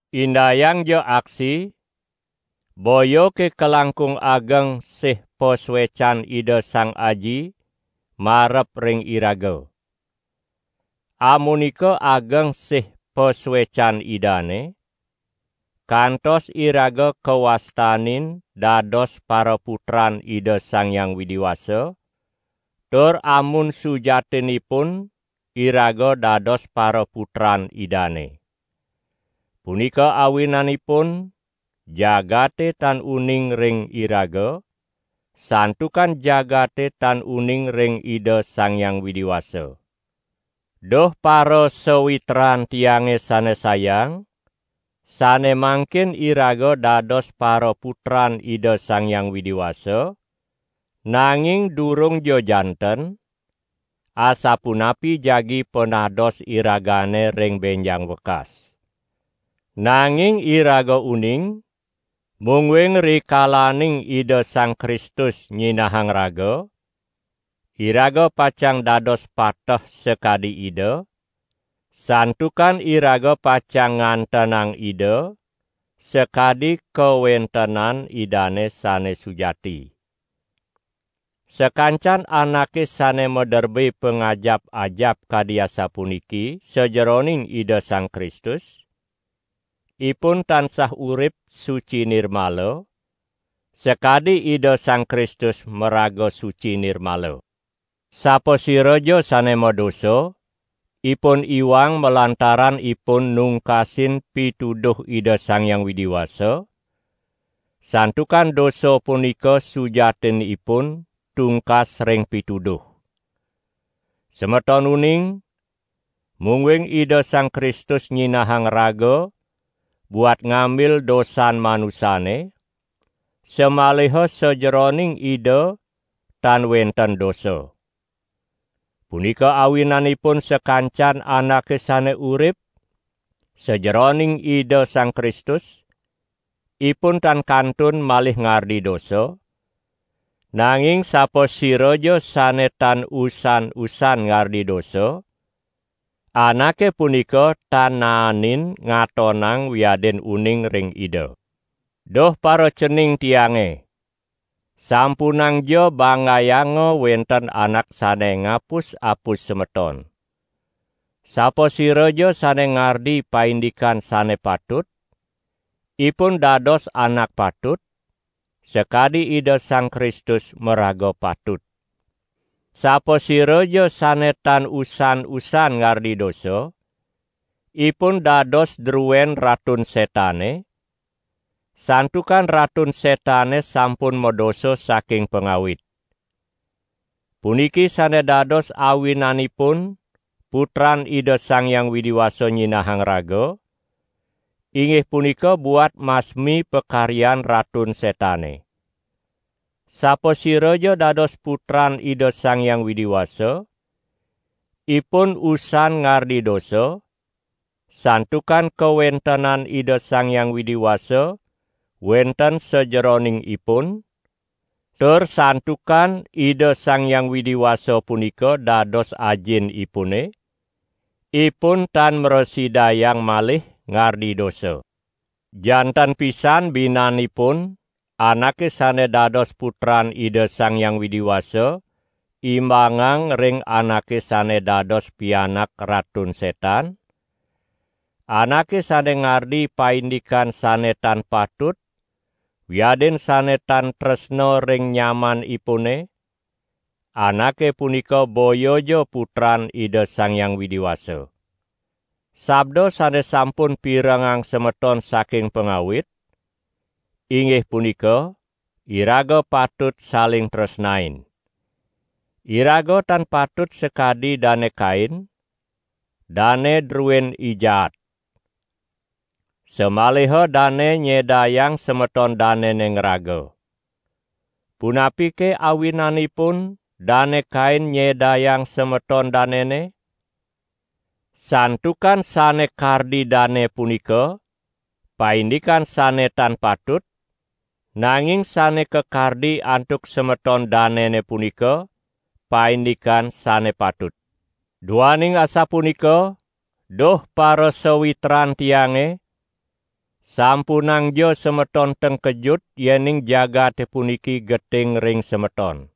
Indayangja aksi, boyake kalangkung ageng sih pasuecan Ida Sang Aji marep ring iraga. Amunika ageng sih pasuecan Idane, kantos iraga kawastanin dados paraputran Ida Sang Hyang Widi Wasa; tur amun sujatinipun iraga dados paraputran Idane. Punika awinanipun jagate tan uning ring iraga, santukan jagate tan uning ring Ida Sang Hyang Widi Wasa. Duh parasawitran tiange sane sayang, sane mangkin iraga dados paraputran Ida Sang Hyang Widi Wasa, nanging durungja janten, asapunapi jagi panados iragane ring benjang wekas. Nanging iraga uning, mungguing rikalaning Ida Sang Kristus nyinahang raga, iraga pacang dados pateh sakadi Ida, santukan iraga pacang ngantenang Ida sakadi kawentenan Idane sane sujati. Sakancan anake sane maderbe pangajap-ajap kadi asapuniki sajeroning Ida Sang Kristus, ipun tansah urip suci nirmala, sakadi Ida Sang Kristus maraga suci nirmala. Sapasiraja sane madosa, ipun iwang malantaran ipun nungkasin pituduh Ida Sang Hyang Widi Wasa; santukan dosa punika sujatinipun tungkas ring pituduh. Semeton uning, mungguing Ida Sang Kristus nyinahang raga buat ngambil dosan manusane, samaliha sajeroning Ida tan wenten dosa. Punika awinanipun sakancan anake sane urip sajeroning Ida Sang Kristus, ipun tan kantun malih ngardi dosa; nanging sapasiraja sane tan usan-usan ngardi dosa, anake punika tan naenin ngatonang wiadin uning ring Ida. Duh paracening tiange. Sampunangja banggayanga wenten anak sane ngapus-apus semeton. Sapasiraja sane ngardi paindikan sane patut, ipun dados anak patut, sakadi Ida Sang Kristus maraga patut. Sapasiraja sane tan usan-usan ngardi dosa, ipun dados druen Ratun Setane, santukan Ratun Setane sampun madosa saking pangawit. Puniki sane dados awinanipun Putran Ida Sang Hyang Widi Wasa nyinahang raga, inggih punika buat masmi pakaryan Ratun Setane. Sapasiraja dados putran Ida Sang Hyang Widi Wasa, ipun usan ngardi dosa; santukan kawentenan Ida Sang Hyang Widi Wasa wenten sajeroning ipun; tur santukan Ida Sang Hyang Widi Wasa punika dados Ajinipune, ipun tan mrasidayang malih ngardi dosa. Janten pisan binanipun anake sane dados putran Ida Sang Hyang Widi Wasa imbangang ring anake sane dados pianak Ratun Setan: anake sane ngardi paindikan sane tan patut wiadin sane tan tresna ring nyamanipune, anake punika boyaja putran Ida Sang Hyang Widi Wasa. Sabda sane sampun pirengang semeton saking pangawit, inggih punika: iraga patut saling tresnain. Iraga tan patut sakadi Dane Kain, dane druen I Jaat, samaliha dane nyedayang semeton danene ngraga. Punapike awinanipun Dane Kain nyedayang semeton danene? Santukan sane kardi dane punika paindikan sane tan patut, nanging sane kakardi antuk semeton danene punika paindikan sane patut. Duaning asapunika, duh parasawitran tiange, sampunangja semeton tengkejut yening jagate puniki geting ring semeton.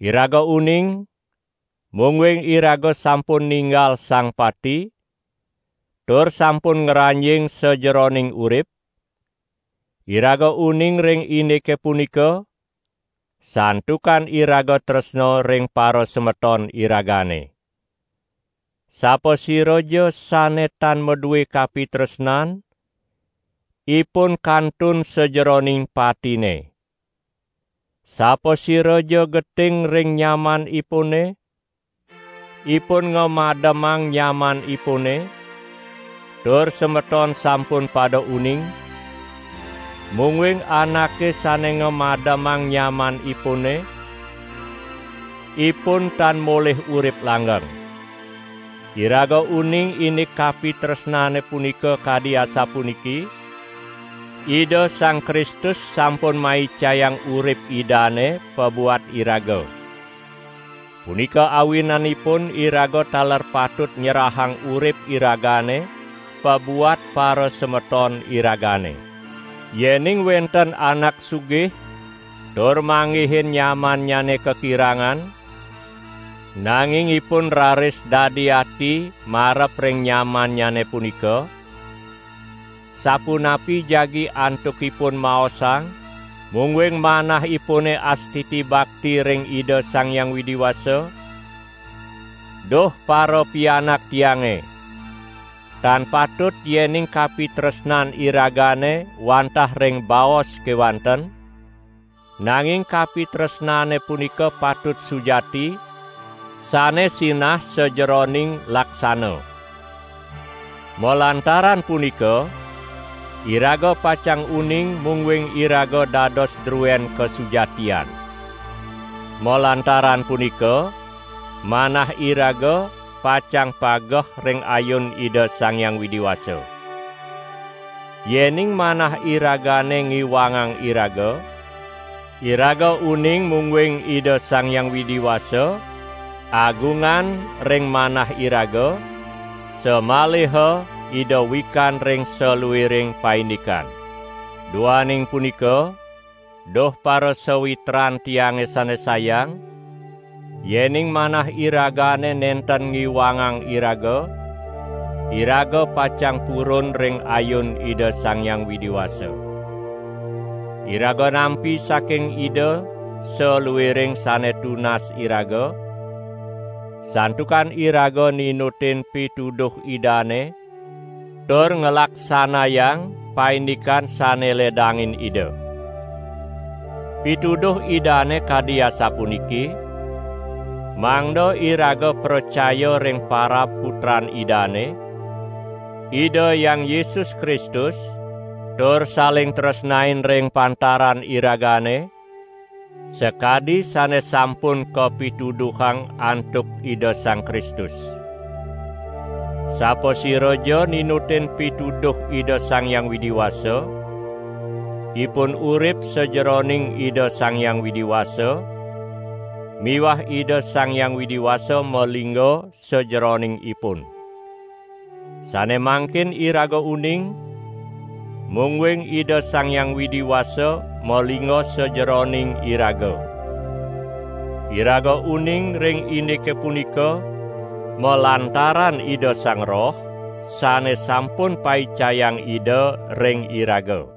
Iraga uning, mungguing iraga sampun ninggal sang pati tur sampun ngranjing sajeroning urip; iraga uning ring indike punika, santukan iraga tresna ring parasemeton iragane. Sapasiraja sane tan madue kapitresnan, ipun kantun sajeroning patine. Sapasiraja geting ring nyamanipune, ipun ngamademang nyamanipune; tur semeton sampun pada uning, mungguing anake sane ngamademang nyamanipune, ipun tan molih urip langgeng. Iraga uning indik kapitresnane punika kadi asapuniki: Ida Sang Kristus sampun maicayang urip Idane pabuat iraga. Punika awinanipun iraga taler patut nyerahang urip iragane pabuat parasemeton iragane. Yening wenten anak sugih tur manggihin nyamannyane kakirangan, nanging ipun raris dadi ati marep ring nyamannyane punika, sapunapi jagi antukipun maosang, mungguing manahipune astiti bakti ring Ida Sang Hyang Widi Wasa? Duh parapianak tiange! Tan patut yening kapitresnan iragane wantah ring baos kewanten, nanging kapitresnane punika patut sujati, sane sinah sajeroning laksana. Malantaran punika iraga pacang uning mungguing iraga dados druen kasujatian. Malantaran punika manah iraga pacang pageh ring ayun Ida Sang Hyang Widi Wasa. Yening manah iragane ngiwangang iraga, iraga uning mungguing Ida Sang Hyang Widi Wasa agungan ring manah iraga, samaliha Ida wikan ring saluiring paindikan. Duaning punika, duh parasawitran tiange sane sayang, yening manah iragane nenten ngiwangang iraga, iraga pacang purun ring ayun Ida Sang Hyang Widi Wasa. Iraga nampi saking Ida saluiring sane tunas iraga, santukan iraga ninutin pituduh Idane tur nglaksanayang paindikan sane ledangin Ida. Pituduh Idane kadi asapuniki: mangda iraga pracaya ring parab Putran Idane, Ida Hyang Yesus Kristus tur saling tresnain ring pantaran iragane, sakadi sane sampun kapituduhang antuk Ida Sang Kristus. Sapasiraja ninutin pituduh Ida Sang Hyang Widi Wasa, ipun urip sajeroning Ida Sang Hyang Widi Wasa miwah Ida Sang Hyang Widi Wasa malingga sajeroning ipun. Sane mangkin iraga uning, mungguing Ida Sang Hyang Widi Wasa malingga sajeroning iraga. Iraga uning ring indike punika malantaran Ida Sang Roh sane sampun paicayang Ida ring iraga.